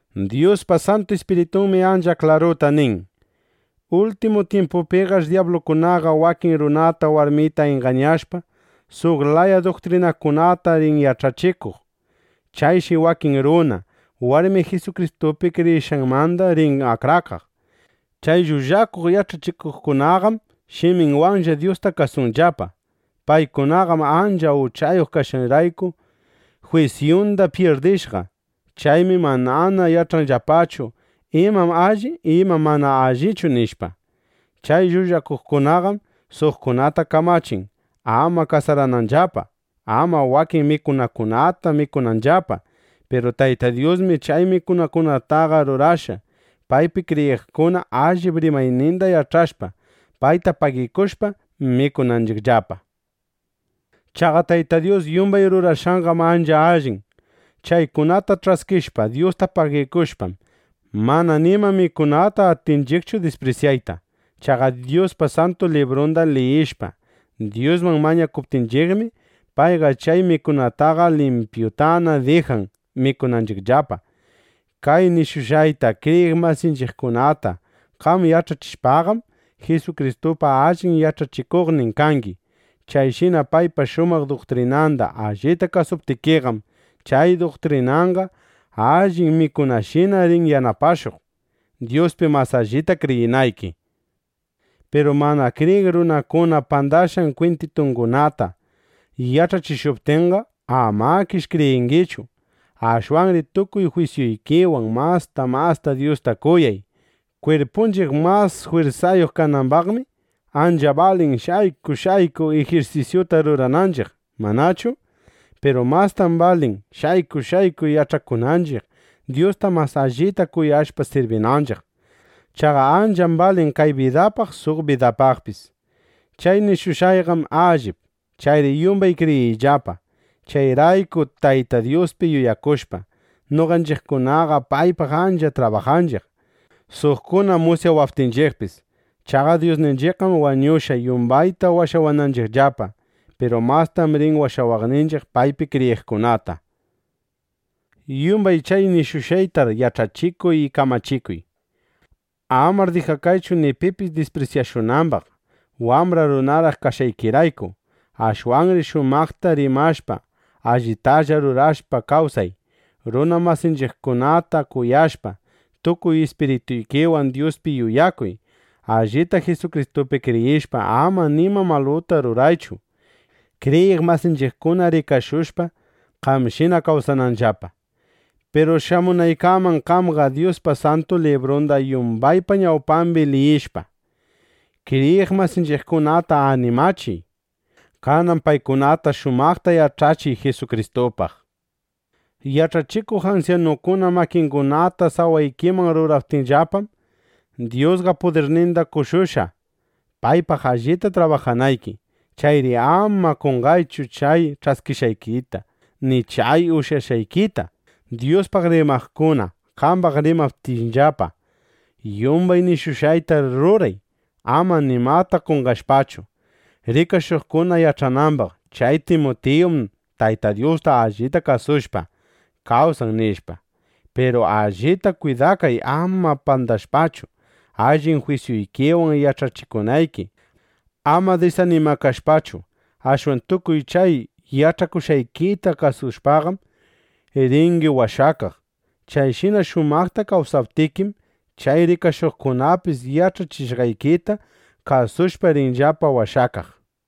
Dyuspa Santu Ispiritunmi ancha klaruta nin: Ultimu tyimpupiqash dyablukunaqa wakin runata warmita ingañashpa, suq laya duktrinakunata rin yach'achikuq. Chayshi wakin runa, warmi Jisukristupi kriyishqanmanda rin akrakaq. Chay llullakuq yach'achikuqkunaqam shiminllapawanlla Dyusta kasunllapa. Paykunaqam ancha uchayuq kashqanrayku, jwisyunda pyirdishqa. Chaymi manana yach'anllapachu: Imam alli, imam mana allichu, nishpa. Chay llullakuqkunaqam suqkunata kamachin, ama kasarananllapa, ama wakin mikunakunata mikunanllapa. Piru Tayta Dyusmi chay mikunakunataqa rurashqa, paypi kriyiqkuna, allip rimayninda yach'ashpa, payta pagikushpa, mikunanchiqllapa. Chaqa Tayta Dyus yumbay rurashqanqam ancha allin. Chaykunata ch'askishpa, Dyusta pagikushpam, mana nima mikunata atinchiqchu disprisyayta. Chaqa Dyuspa Santu Librunda liyishpa, Dyusman mañakuptinchiqmi, payqa chay mikunataqa limpyutana dijan mikunanchiqllapa. Kay nishushqayta kriyiq masinchiqkunata qam yach'achishpaqam, Jisukristupa allin yach'achikuqnin kangi. Chayshina paypa shumaq duktrinanda allita kasuptikiqam, chay duktrinanqa allin mikunashina rin yanapashuq, Dyuspi mas allita kriyinayki. Piru mana kriyiq runakuna pandashqan kwintitungunata yach'achishuptinqa, amakish kriyingichu. Ashwanri tukuy jwisyuykiwan masta masta Dyusta kuyay. Kwirpunchiq mas jwirsayuq kanambaqmi, ancha balin shayku shayku ijirsisyuta rurananchiq, ¿manachu? Piru mastam balin shayku shayku yach'akunanchiq, Dyusta mas allita kuyashpa, sirbinanchiq. Chaqa ancham balin kay bidapaq suq bidapaqpis. Chay nishushqayqam allip. Chayri yumbay kriyinqallapa. Chayraykur Tayta Dyuspi yuyakushpa, noqanchiqkunaqa paypaq ancha trabajanchiq, suqkuna musyawaptinchiqpis. Chaqa Dyusninchiqqam wañushqa, yumbayta washawananchiqllapa. Piru mastam rin washawaqninchiq paypi kriyiqkunata. Yumbay chay nishushqaykunatar yach'achikuy y kamachikuy. Amar dijakaychu ni pipis disprisyashunambaq, wambra runaraq kashqaykiraykuqa. Ashwanri shumaqta rimashpa, allitalla rurashpa kawsay. Runa masinchiqkunata kuyashpa, tukuy ispirituykiwan Dyuspi yuyakuy. Allita Jisukristupi kriyishpa, ama nima maluta ruraychu, kriyiq masinchiqkuna rikashushpa, qamshina kawsananllapa. Piru shamunaykaman, qamqa Dyuspa Santu Librunda yumbaypa ñawpambi liyishpa, kriyiq masinchiqkunata animachiy. Kanan paykunata shumaqta yach'achiy Jisukristupaq. Yach'achikuq ansyanukuna makingunata sawaykiman ruraptinllapam, Dyusqa pudirninda qoshushqa, paypaq allita trabajanayki. Chayri ama qonqaychu chay ch'askishqaykita ni chay uyashqaykita, Dyuspaq rimaqkuna qambaq rimaptinllapa. Yumbay nishushqaytar ruray, ama nimata qonqashpachu, rikashuqkuna yach'anambaq: Chay Timutiyum Tayta Dyusta allita kasushpa, kawsan, nishpa. Piru allita kwidakay, ama pandashpachu, allin jwisyuykiwan yach'achikunayki. Ama disanimakashpachu, ashwan tukuy chay yach'akushqaykita kasushpaqam, ringi washakaq. Chayshina shumaqta kawsaptikim, chay rikashuqkunapis yach'achishqaykita kasushpa rinllapa washakaq.